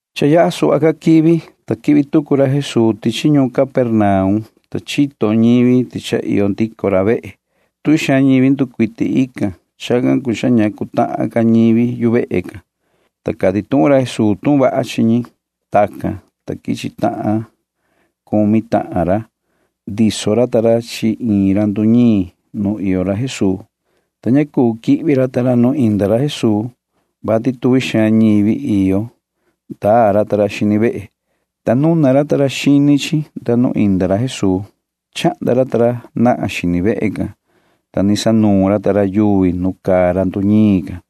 Cha yaha suhva quivi, ta quihvi tucu ra Jesuu tichi ñuun Capernaum, ta chini ñivi tuhun ti cha iyo ndico ra vehe. Ni nducuiti tuvi ñivi tican. Chacan cuu cha ña cuu ca queta ñivi yu vehe can, ta cati tuhun ra Jesuu tuhun vaha chi ñi. Tacan, ta quichi tahan cumi tahan ra. Ndiso ra ta ra chi iin ra nduñiin nu iyo ra Jesuu, ta ña cuu yaha ra ta ra nu iyo ra Jesuu, vati tuvi xaan ñivi iyo. [Ndaa ra ta ra nda xini vehe,] ta nuna ra ta ra xini vehe can nu indi ra Jesuu. Chahnda ra ta ra nahan xini vehe can, ta ni sanuun ra ta ra yuvi nu caa ra nduñiin can.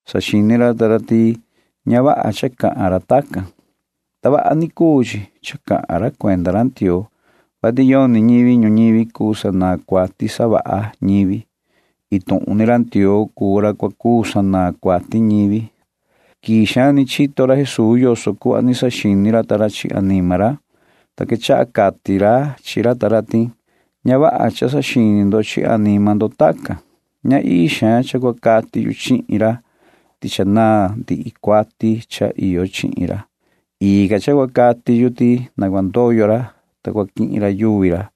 Saxini ra ta ra ti ña vaha cha cahan ra tacan. Ndavaha ni cuu chi cha cahan ra cuenda ra Ndioo, vati yoni ñivi ñuñivi cuu sanaan cuati savaha ñivi. Iin tuhun ni ra Ndioo cuu ra cua cuu sanaan cuati ñivi, saxini ra ta ra. Quii xaan ni chito ra Jesuu yoso cuhva ni saxini ra ta ra chi anima ra, ta quechaha cati ra chi ra ta ra ti: ―Ña vaha cha saxini ndo chi anima ndo tacan. Ña ii xaan cha cua cati yu chihin ra ti cha naan ndihi cuati cha iyo chihin ra. Ii ca cha cua cati yu ti na cua ndoyo ra, ta cua quihin ra yuvi ra,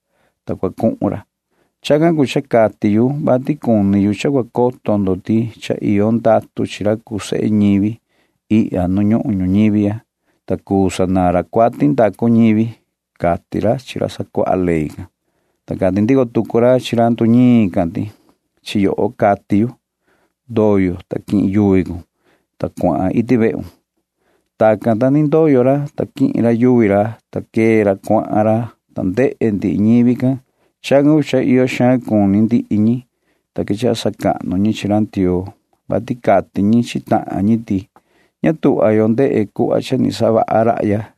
ta cua cuhun ra. Chacan cuu cha cati yu vati cuni yu cha cua coto ndo ti cha iyo ndatu chi ra cuu sehe ñivi ihya nu ñuhun ñuñivi ya, ta cuu sanaan ra cuati savaha ñivi ―cati ra chi ra sacuaha ley can. Ta cati ndico tucu ra chi ra nduñiin can ti: ―Chi yoho cahin. Ndoyo, ta quihin cun yuvi cun, ta cuahan iti vehun ―cati ra Jesuu. Tacan, ta ni ndoyo ra, ta quihin ra yuvi ra, ta quee ra cuahan ra, ta ndehe ndihi ñivi can. Chacan cuu cha iyo xaan cuni ndihi ñi, ta quechaha sacahnu ñi chi ra Ndioo, vati cati ñi chi tahan ñi ti: ―Ña tuhva yo ndehe yo cha ni savaha rahya nu ni quichi quivi ―cati ñi.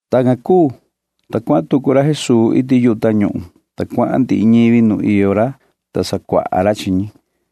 Tacan cuu, ta quee ndico tucu ra Jesuu, ta cuahan ra. Iti yuhu tañuhun cuahan tucu ra, ta cuahan ndihi ñivi nu iyo ra, ta sacuaha ra chi ñi.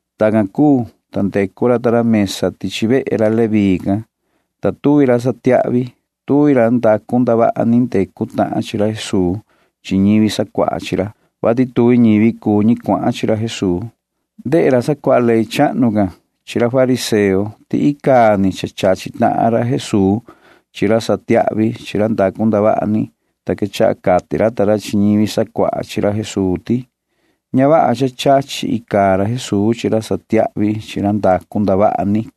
Tacan cuu, ta ndecu ra ta ra mesa tichi vehe ra Leví can, ta tuvi ra satiahvi, tuvi ra ndacu ndavaha ni ndecu tahan chi ra Jesuu chi ñivi sacuaha chi ra, vati tuvi ñivi cuu ñi cuahan chi ra Jesuu. Ndehe ra sacuaha ley chahnu can chi ra fariseo ti icaa ni cha chachi tahan ra Jesuu chi ra satiahvi chi ra ndacu ndavaha ni, ta quechaha cati ra ta ra chi ñivi sacuaha chi ra Jesuu ti: ―Ña vaha cha chachi ra Jesuu chi ra satiahvi chi ra ndacu ndavaha ni icaa ni ―cati ra ta ra.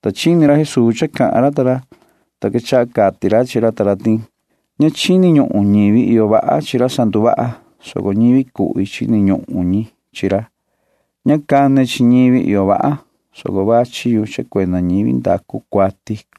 Ta chini ra Jesuu cha cahan ra ta ra, ta quechaha cati ra chi ra ta ra ti: ―Ña chini ñuhun ñivi iyo vaha chi ra sanduvaha chi ñi, soco ñivi cuhvi cuu ñi chini ñuhun chi ra. Ña cane chi ñivi iyo vaha, soco vachi yu, ta cane chi ñivi ndacu cuati ―cati ra.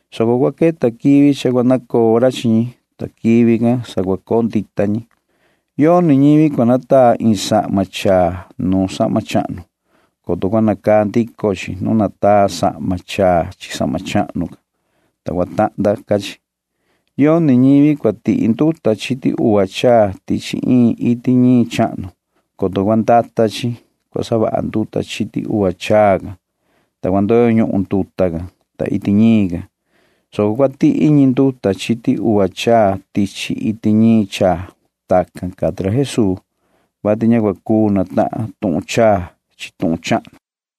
soco cua queta quivi cha cua nacoo ra chi ñi, ta quivi can sa cua coo ndita ñi. ’Yoni ñivi cua nataa iin sahma chaa nuun sahma chahnu, coto cua nacaa ndico chi nu nataa sahma chaa chi sahma chahnu can, ta vihi ca cua ndoo chi cha lahnda ca chi. Yoni ñivi cua tihi nduta chiti uva chaa tichi iin iti ñiin chahnu, coto cua ndata chi cua savaha nduta chiti uva chaa can, ta cua cati nduta can, ta cua ndoyo ñuhun iti ñiin can, soco cua tihi ñi nduta chiti uva chaa tichi iti ñiin chaa. [Tacan cati ra Jesuu, vati ña cua cuu natahan tuhun chaa chi tuhun chahnu.]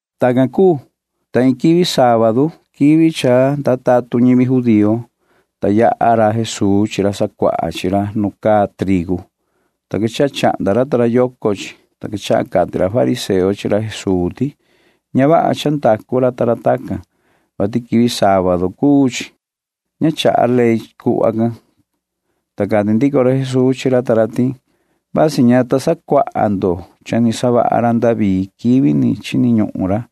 Tacan cuu, ta iin quivi sábadu [quivi cha ndaa tatun ñivi judío], ta yaha ra Jesuu chi ra sacuaha chi ra nu caa itu trigu, ta quechaha yucu racan ta ra xini chi, ta quechaha cati ra fariseo chi ra Jesuu ti: ―Ña vaha cha ndacu ra ta ra tacan, vati quivi sábadu cuu chi. Ña chaha ley cuhva can ―cati ra fariseo can. Ta cati ndico ra Jesuu chi ra ta ra ti: ―Vasi ña ta sacuaha ndo cha ni savaha ra David quivi chini ñuhun ra,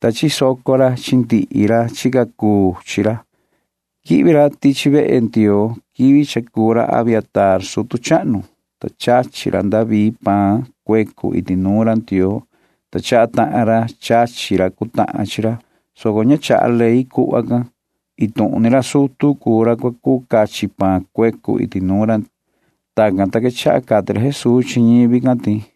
ta chisoco ra chi ndihi ra chica chi ra. Quihvi ra tichi vehe Ndioo quivi cha cuu ra Abiatar sutu chahnu, ta chachi ra David can paan cuecu iti nuun ra Ndioo, ta chaha ra cha chachi tahan ra iyo chi ra, soco ña chaha ley cuhva can. Iin tuhun ni ra sutu cuu ra cua cuu cachi paan cuecu iti nuun ra Ndioo ―cati ra. Tacan, ta quechaha cati ra Jesuu chi ñivi can ti: